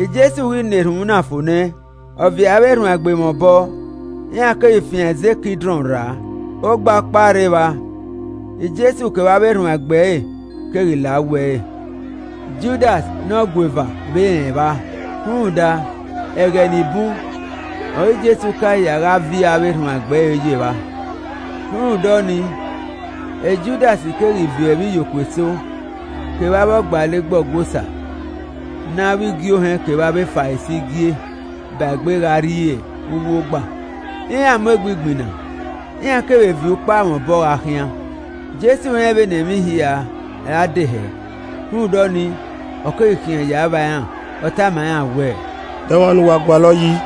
Jesu ghi na erhunmwu na fo nẹ, ọ viọ avbe erhuanegbe mwẹ obọ, iran keghi fian ẹzẹ Kidrọn rra, ogba ọkpa rre evba, Jesu kevbe avbe erhuanegbe ẹre keghi la uwu ẹre. Judas ne ọgueva vbe rẹn evba, rhunmwuda ẹghẹ ni bun ọre Jesu ka ya gha viọ avbe erhuanegbe ẹre yo evba. Rhunmwuda ọnii Judas keghi viọ ivbiyokuo eso kevbe avbe ọgbalegbe Ọgua Osa ne avbe igie ohẹn kevbe avbe Farisi gie, ba egbe gha rrie uwu ogba, iran mu egbe igbinna, iran keghi vbe viọ ukpa mwẹ obọ gha khian. Jesu rẹn vbene emwi hia ra de hẹ, rhunmwuda ọnii, ọ keghi khian ya vba iran, ọ tama iran wẹẹ, “De ọmwa ne uwa gualọ yi?”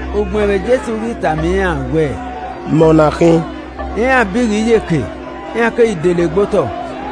Ugbẹn vbe Jesu ghi tama iran wẹẹ, “Mẹ ọna khin.” Iran bi ghe iyeke, iran keghi dele gbe otọ.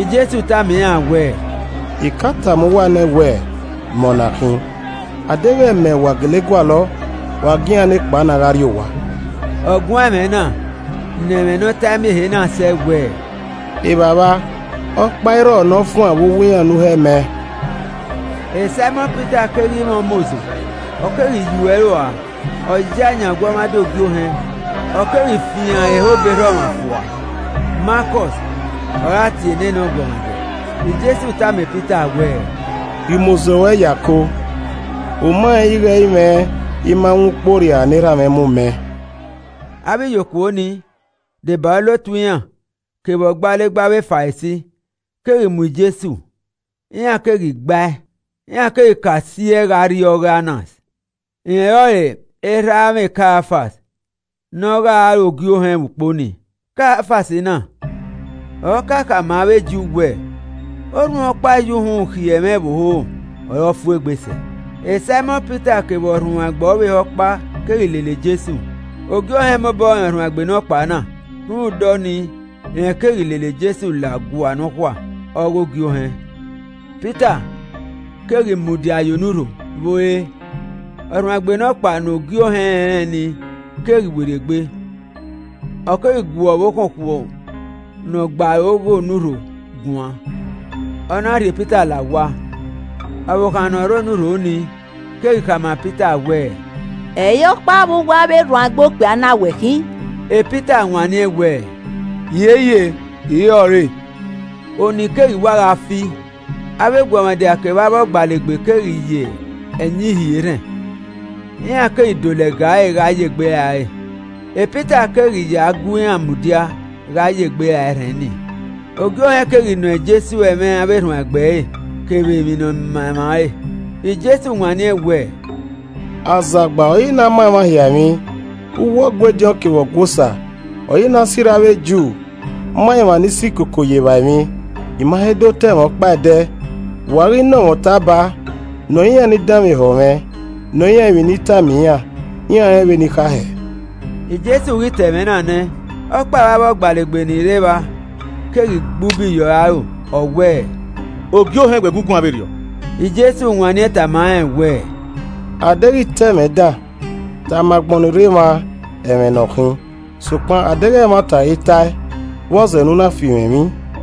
Jesu tama iran wẹẹ, “I ka tama uwa nẹ wẹ, ‘Mẹ ọna khin,’ A deghẹ mẹ ọre uwa gele gualọ, wa gie iran nekpa na gha rrie owa.” (Ọ guan ẹmwẹ na ne ẹmwẹ ne ọ tae miẹn ehe na sẹ wẹ, “Evbavba, ọkpa irrọ ne ọ fuan vbe uwu iran ne u hẹ mẹ.”) Saimọn Pita keghi mwẹ umozo, ọ keghi yuo ẹre ua, ọ ya yan ọguọmwadia Ogie Ohẹn, ọ keghi fian ẹre ehọ obọ erha ọmwa fua. Malkọs ọre a tie nene ọguọmwadia. Jesu tama Pita wẹ, “Rhie umozo ruẹ ye ako. U ma rẹn ighẹ ẹ i mwẹ I ma wọn ukpu orriara ne Erha mwẹ mu mẹ?” Avbe ivbiyokuo nii, deba olotu iran kevbe ọgbalegbe avbe Farisi keghi mu Jesu, iran keghi gba ẹe. Iran keghi ka si ẹe gha rrie ọghe Anas. Rẹn ọrọre erha amwẹ Kaiafas ne ọ gha re ogie ohẹn vbe ukpo nii. Kaiafas na ọre ọ ka khama avbe Ju wẹẹ orhunmwu ọkpa ya uhunmwu khiẹ ẹmwẹ ẹvbo hoho ọre ọ fu egbe sẹ. Saimọn Pita kevbe ọrhuanegbe ọvbehe ọkpa keghi lele Jesu. Ogie Ohẹn mobọ rẹn ọrhuanegbe nọkpa na, rhunmwuda ọnii rẹn keghi lele Jesu la ọgua nọkhua ọghe Ogie Ohẹn. Pita keghi mudia ye onurho vbe ore. Ọrhuanegbe nọkpa ne ogie ohẹn rẹnrẹn nii keghi werriegbe, ọ keghi gu ọvbokhan okhuo ne ọ gbe aro ghe onurho guan, ọ na rhie Pita la owa. Ọvbokhan ne ọ rre onurho nii keghi khama Pita wẹẹ, “Ẹ i re ọkpa vbe uwu avbe erhuanegbe okpia na wẹ khin?” Pita wanniẹn wẹẹ, “Hiehie, I i re ọre.” Ọnii keghi wa gha fi, avbe eguọmwadia kevbe avbe ọgbalegbe keghi ya ẹyin hie erhẹn, iran keghi do lẹga ẹre gha ye egbe ra ẹre. Pita keghi ya gu iran mudia gha ye egbe ra erhẹn nii. Ogie Ohẹn keghi nọ Jesu ẹmwẹ avbe erhuanegbe ẹre kevbe emwi ne ọ ma emwa ẹre. Jesu wanniẹn wẹẹ, “Azagba ọre I na ma emwa hia emwi, uwu Ọgua ediọn kevbe ọgua Osa ọre I na sirra avbe Ju ma emwa ni si koko ye evba emwi. I ma he do ta ẹmwẹ ọkpa ẹdẹ. Vbe u a ghi nọ mwẹ ọta ba? Nọ iran ni danmwehọ mwẹ. Nọ iran emwi ne I tama iran. Iran rẹn vbe ne I kha hẹ.” Jesu ghi ta ẹmwẹ na nẹ, ọkpa vbe avbe ọgbalegbe ni rre evba keghi gbe ubi ye ọre aro, ọ wẹẹ, “Ogie Ohẹn wẹ gu guan vberriọ!” Jesu wanniẹn tama rẹn wẹẹ, “A deghẹ I ta ẹmwẹ dan, tama agbọn ni rre emwa ẹmwẹ ne ọ khin, sokpan a deghẹ ẹmwata ọre I ta ẹe, vbọzẹ ne u na fi mwẹ emwi?”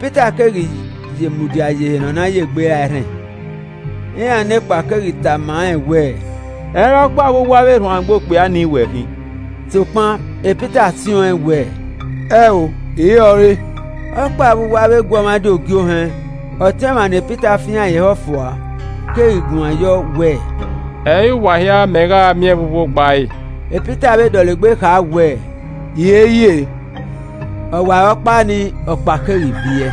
Pita keghi ye mudia ye ehe ne ọ na ya egbe ra erhẹn. Iran nekpa keghi tama rẹn wẹẹ, “Ẹ i re ọkpa vbe uwu avbe erhuanegbe okpia ni wẹ khin?” Sokpan Pita siẹn ọ wẹẹ, “Ẹn o, I i re ọre!” Ọkpa vbe uwu avbe eguọmwadia Ogie Ohẹn, ọtẹn ọmwa ne Pita fian ẹre ehọ fua keghi guan yọ, ọ wẹẹ, “Ẹ i re uwa hia mẹ gha miẹn vbe uwu ogba ẹre?” Pita vbe dọlegbe kha wẹẹ, “Hiehiere,” ọwarọkpa nii, ọkpa keghi viẹ.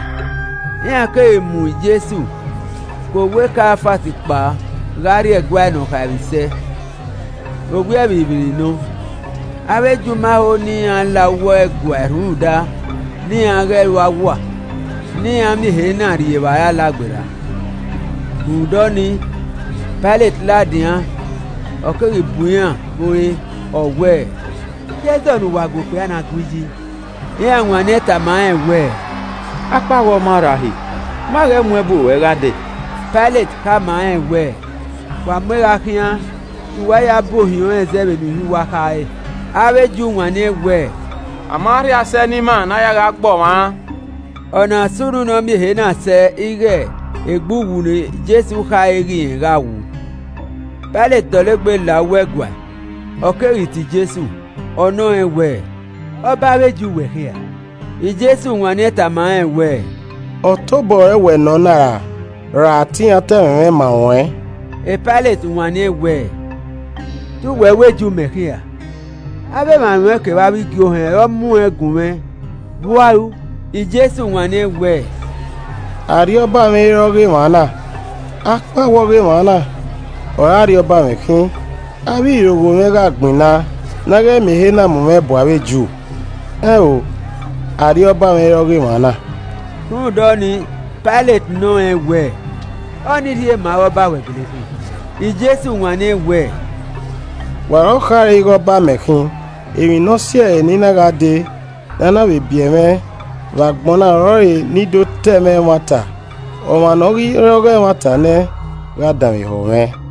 Iran keghi mu Jesu ke owa Kaiafas kpao gha rrie ẹguae Ne ọ khaemwisẹ. Owiẹ vbirrivbirri nọ. Avbe Ju ma ho ne iran la uwu ẹguae rhunmwuda ne iran ghẹ ru awua, ne iran miẹn ehe na rrie evbare Alagberra. Rhunmwuda ọnii, Pailet ladian, ọ keghi bu iran vbe ore, ọ wẹẹ, “De ẹzọ ne uwa gu okpia na gui yi?” Iran wanniẹn tama rẹn wẹẹ, “Akpawẹ ọ ma rra uhi, ma ghẹ mu ẹ bu ruẹ gha dee.” Pailet khama iran wẹẹ, “Wa mu ẹn gha khian ne uwa ya bu ohiẹn ọnrẹn zẹ vbene uhi uwa kha re.” Avbe Ju wanniẹn wẹ, “A ma rhie asẹ ne ima ne a ya gha gbe ọmwa ran.” (Ọna sunu ne ọ miẹn ehe na sẹ ighe egbe uwu ne Jesu khare ighe rẹn gha wu.) Pailet dọlegbe la uwu ẹguae, ọ keghi tie Jesu, ọ nọ rẹn wẹẹ, “Ọba avbe Ju wẹ khin ra?” Jesu wanniẹn tama rẹn wẹẹ, “Ọta obọ ruẹ wẹ nọ na ra, ra te iran ta ẹmwẹ mwẹ ma ruẹn?” Pailet wanniẹn wẹẹ, “Te uwẹ wẹ Ju mẹ khin ra, avbe emwa ruẹn kevbe avbe igie ohẹn ọre ọ mu ẹn gun mwẹ, vbe u a ru?” Jesu wanniẹn wẹẹ, “Arriọba mwẹ i re ọghe emwa na, akpawẹ ọghe emwa na ọre arriọba mwẹ khin, avbe irogho mwẹ gha gbinna ne a ghẹ miẹn ehe na mu mwẹ bu avbe Ju. Ẹn o, arriọba mwẹ i re ọghe emwa na.” Rhunmwuda ọnii, Pailet nọ rẹn wee, “Ọnii rhie ma ighe ọba we gele khin?” Jesu wanniẹn wẹẹ, “Wa ọre ọ khare ighe ọba mẹ khin. Emwi ne ọ si ẹe ne I na gha dee, ne a na vbe biẹ mwẹ vbe agbọn na ọrọre ne I do ta ẹmwẹ ẹmwata, ọmwa ne ọ ghi re ọghe ẹmwata nẹ gha danmwehọ mwẹ.”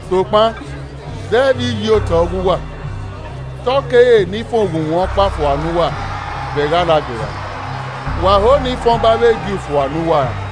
Sokpan zẹ vbe iyi otọ ọghe uwa, te ọ kere ne I fan oghunmwu ọkpa fua ne uwa vbe ẹghẹ Alagberra. Wa ho ne I fan ọba avbe Ju fua ne uwa ra?”